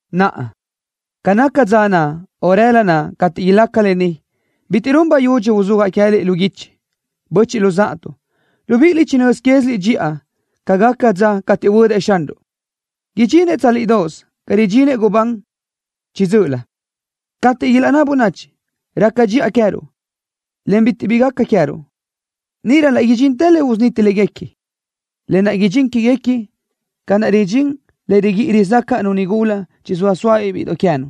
Naʼa, ca naca dza naʼ, o rëla naʼ cateʼ ilaca lë ni, bitiʼ run bayudxi uzúajaʼ queë́liʼ lu guichi, böchiʼ luzáʼatuʼ. Libíʼiliʼ chinö́z quéziliʼ dxiʼa ca gaca dza cateʼ huödëʼ Xanruʼ. Idxinëʼ tsálidoʼos ca ridxinëʼ gubán chiʼi dzö́ʼölö. Cateʼ ilaʼnná bönachi: “Raca dxiʼa queë́ruʼ, en bitiʼ bi gaca queë́ruʼ”, níʼirö laʼ idxintë le usuniti léguequi, lë naʼ idxín quéguequi ca naʼ ridxín le riguíʼi rizácaʼnu nigula naʼ chizóa sóabiʼ bíʼidoʼ queë́nu,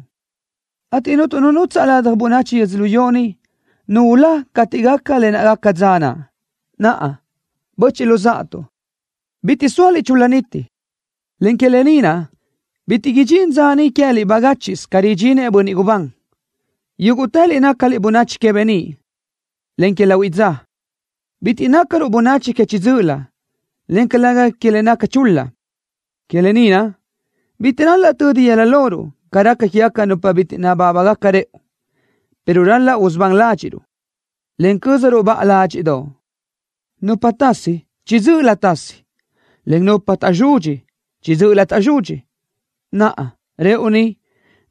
ateʼ cuntu nu nutsaʼ ladaj bönachi yödzölió ni nu ulá cateʼ gaca lë naʼ gaca dza naʼ. Naʼa, böchiʼ luzáʼatuʼ, bitiʼ zóaliʼ chul-la niti, en que lë ni naʼ bitiʼ idxín dza niʼ queë́liʼ bagáchiʼsö ca ridxinëʼ bönniʼ gubán. Yúguʼtëliʼ nácaliʼ bönachi que beníʼ, en que lahuiʼ dza. Bitiʼ nácaruʼ bönachi que chiʼi dzö́ʼölö, en calëga que le naca chul-la. Que lë ni naʼ, bitiʼ ral-laʼ tödi yëla loruʼ ca raca quégaca nupa bitiʼ nabábagaca rëʼu, pero ral-laʼ usubán ládxiʼruʼ, en cö́zaruʼ baʼa ládxiʼdoʼ. Nupa tasi, chiʼi dzö́ʼölö tasi, en nupa taʼzudxi, chiʼi dzö́ʼölö caʼ taʼzudxi. Naʼa, rëʼu ni,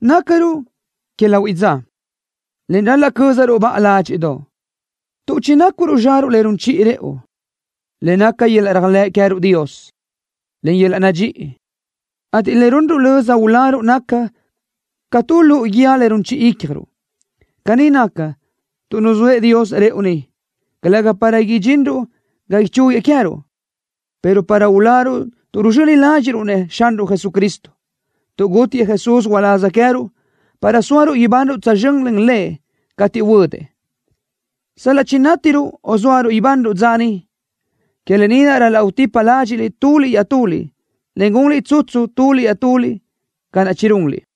nácaruʼ que lahuiʼ dza, en ral-laʼ cö́zaruʼ baʼa ládxiʼdoʼ, tuʼ chinácuruʼ zxaruʼ le run chiʼi rëʼu, le naca yöl-laʼ réajlëʼ queë́ruʼ Dios, en yöl-laʼ nadxíʼi, ateʼ le runruʼ löza uláruʼ naca ca tu luʼu guíë le run chiʼi ícjaruʼ. Caní naca, tuʼ nuzóëʼ Dios rëʼu ni, calëga para idxinruʼ ga ichúguiëʼ queë́ruʼ, pero para uláruʼ tuʼ ruzxöni ládxiʼruʼ-nëʼ Xanruʼ Jesucristo, tuʼ gútiëʼ Jesús uláz queë́ruʼ para sóaruʼ ibanruʼ tsözxö́n len Lëʼ cateʼ huödëʼ, sal-laʼ chinátiruʼ o sóaruʼ ibanruʼ dza niʼ. Que lë ni naʼ ral-laʼ utípaliʼ ládxiʼliʼ tuliʼ iaʼtuliʼ, en gunliʼ tsutsu tuliʼ iaʼtuliʼ ca naʼ chirunliʼ.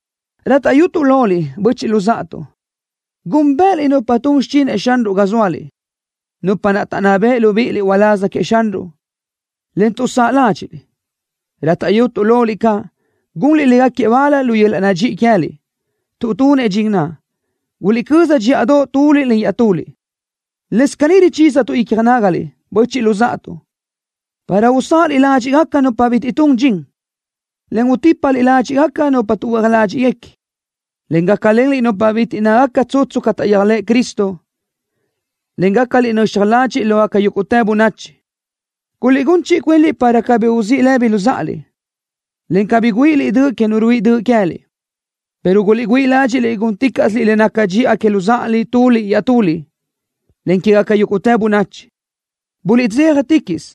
Rátaʼyutuʼ loliʼ, böchiʼ luzáʼatuʼ, gúnbëʼëliʼ nupa tun xichinëʼ Xanruʼ ga zóaliʼ, nupa naʼ taʼnná beʼe libíʼiliʼ uláz queëʼ Xanruʼ, en tuʼsáʼ ládxiʼliʼ. Rátaʼyutuʼ loliʼ caʼ, gunliʼ légaquiëʼ bal lu yöl-laʼ nadxíʼi queë́liʼ, tuʼ tunëʼ dxin naʼ. Guliʼcöza dxíʼadoʼ tuliʼ len iaʼtuliʼ. Lëscaʼ caní richízatuʼ icja nágaliʼ, böchiʼ luzáʼatuʼ, para usáʼaliʼ ládxiʼgaca nupa bitiʼ túngaca dxin, en utípaliʼ ládxiʼgaca nupa tuʼhuö́aj ládxiʼguequi, en gácalenliʼ nupa bitiʼ naca tsutsu ca taʼyéajlëʼ Cristo, en gácaliʼ nöxaj ladxiʼ lógaca yúguʼtë bönachi. Guliʼgún chiʼi cuinliʼ para cabí uzíʼ lëbi luzáʼaliʼ, en cabí guáʼaliʼ döʼ que nu ruáʼ döʼ queë́liʼ, pero guliʼgüíʼ ládxiʼliʼ gúnticaʼsiliʼ le naca dxiʼa que luzáʼaliʼ tuliʼ iaʼtuliʼ, en quégaca yúguʼtë bönachi. Buliʼdzéjaticaʼsö,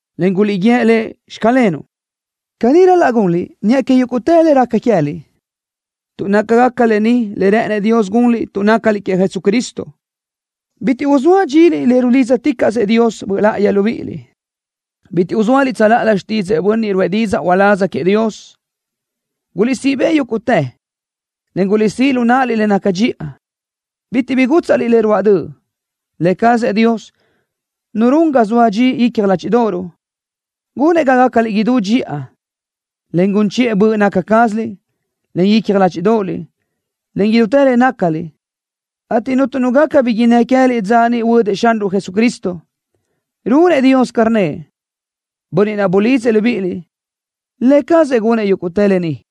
en guliʼguíëʼ Lëʼ: “Xclenuʼ.” Caní ral-laʼ gunliʼ niʼa que yúguʼtë le raca queë́liʼ, tuʼ nácagaca lë ni le rë́ʼënëʼ Dios gunliʼ tuʼ nácaliʼ queëʼ Jesucristo. Bitiʼ uzóa dxiliʼ le rulídzaticaʼsëʼ Dios Böʼ Láʼayi libíʼiliʼ. Bitiʼ uzóaliʼ tsöláʼalö xtídzëʼë bönniʼ ruʼë didzaʼ uláz queëʼ Dios. Guliʼsíʼ bëʼ yúguʼtë, en guliʼsíʼ lu náʼaliʼ le naca dxiʼa. Bitiʼ bi gútsaʼliʼ le ruáʼ döʼ. Lë cazëʼ Dios, Nu run ga zoa dxi icja ládxiʼdoʼoruʼ, gunëʼ ga gácaliʼ idú dxiʼa, en gun chiʼë böʼ naca cázaliʼ, en icja ládxiʼdoʼoliʼ, en idútë le nácaliʼ, ateʼ cuntu nu gaca bi innë́ queë́liʼ dza niʼ huödëʼ Xanruʼ Jesucristo. Runëʼ Dios ca rnnëʼ, Bönniʼ naʼ bulidzëʼ libíʼiliʼ. Lë cazëʼ gunëʼ yuguʼ lë ni.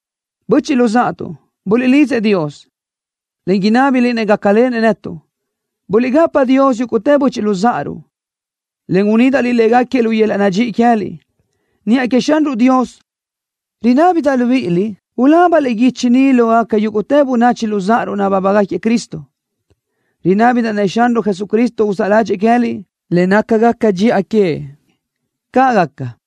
Böchiʼ luzáʼatuʼ, buliʼlidzëʼ Dios, en inábiliʼ-nëʼ gácalenëʼ netuʼ. Buliʼgapa Dios yúguʼtë böchiʼ luzáʼaruʼ, en unídaʼliʼ légaquiëʼ lu yöl-laʼ nadxíʼi queë́liʼ. Niʼa queëʼ Xanruʼ Dios ruchiʼa libíʼiliʼ ulábaliʼ guichi ni lógaca yúguʼtë böchiʼ luzáʼaruʼ nabábagaquiëʼ Cristo. Rinábidaʼ-nëʼ Xanruʼ Jesucristo uzáʼ ládxëʼë queë́liʼ le nácagaca dxiʼa queëʼ. ¡Caʼ gaca!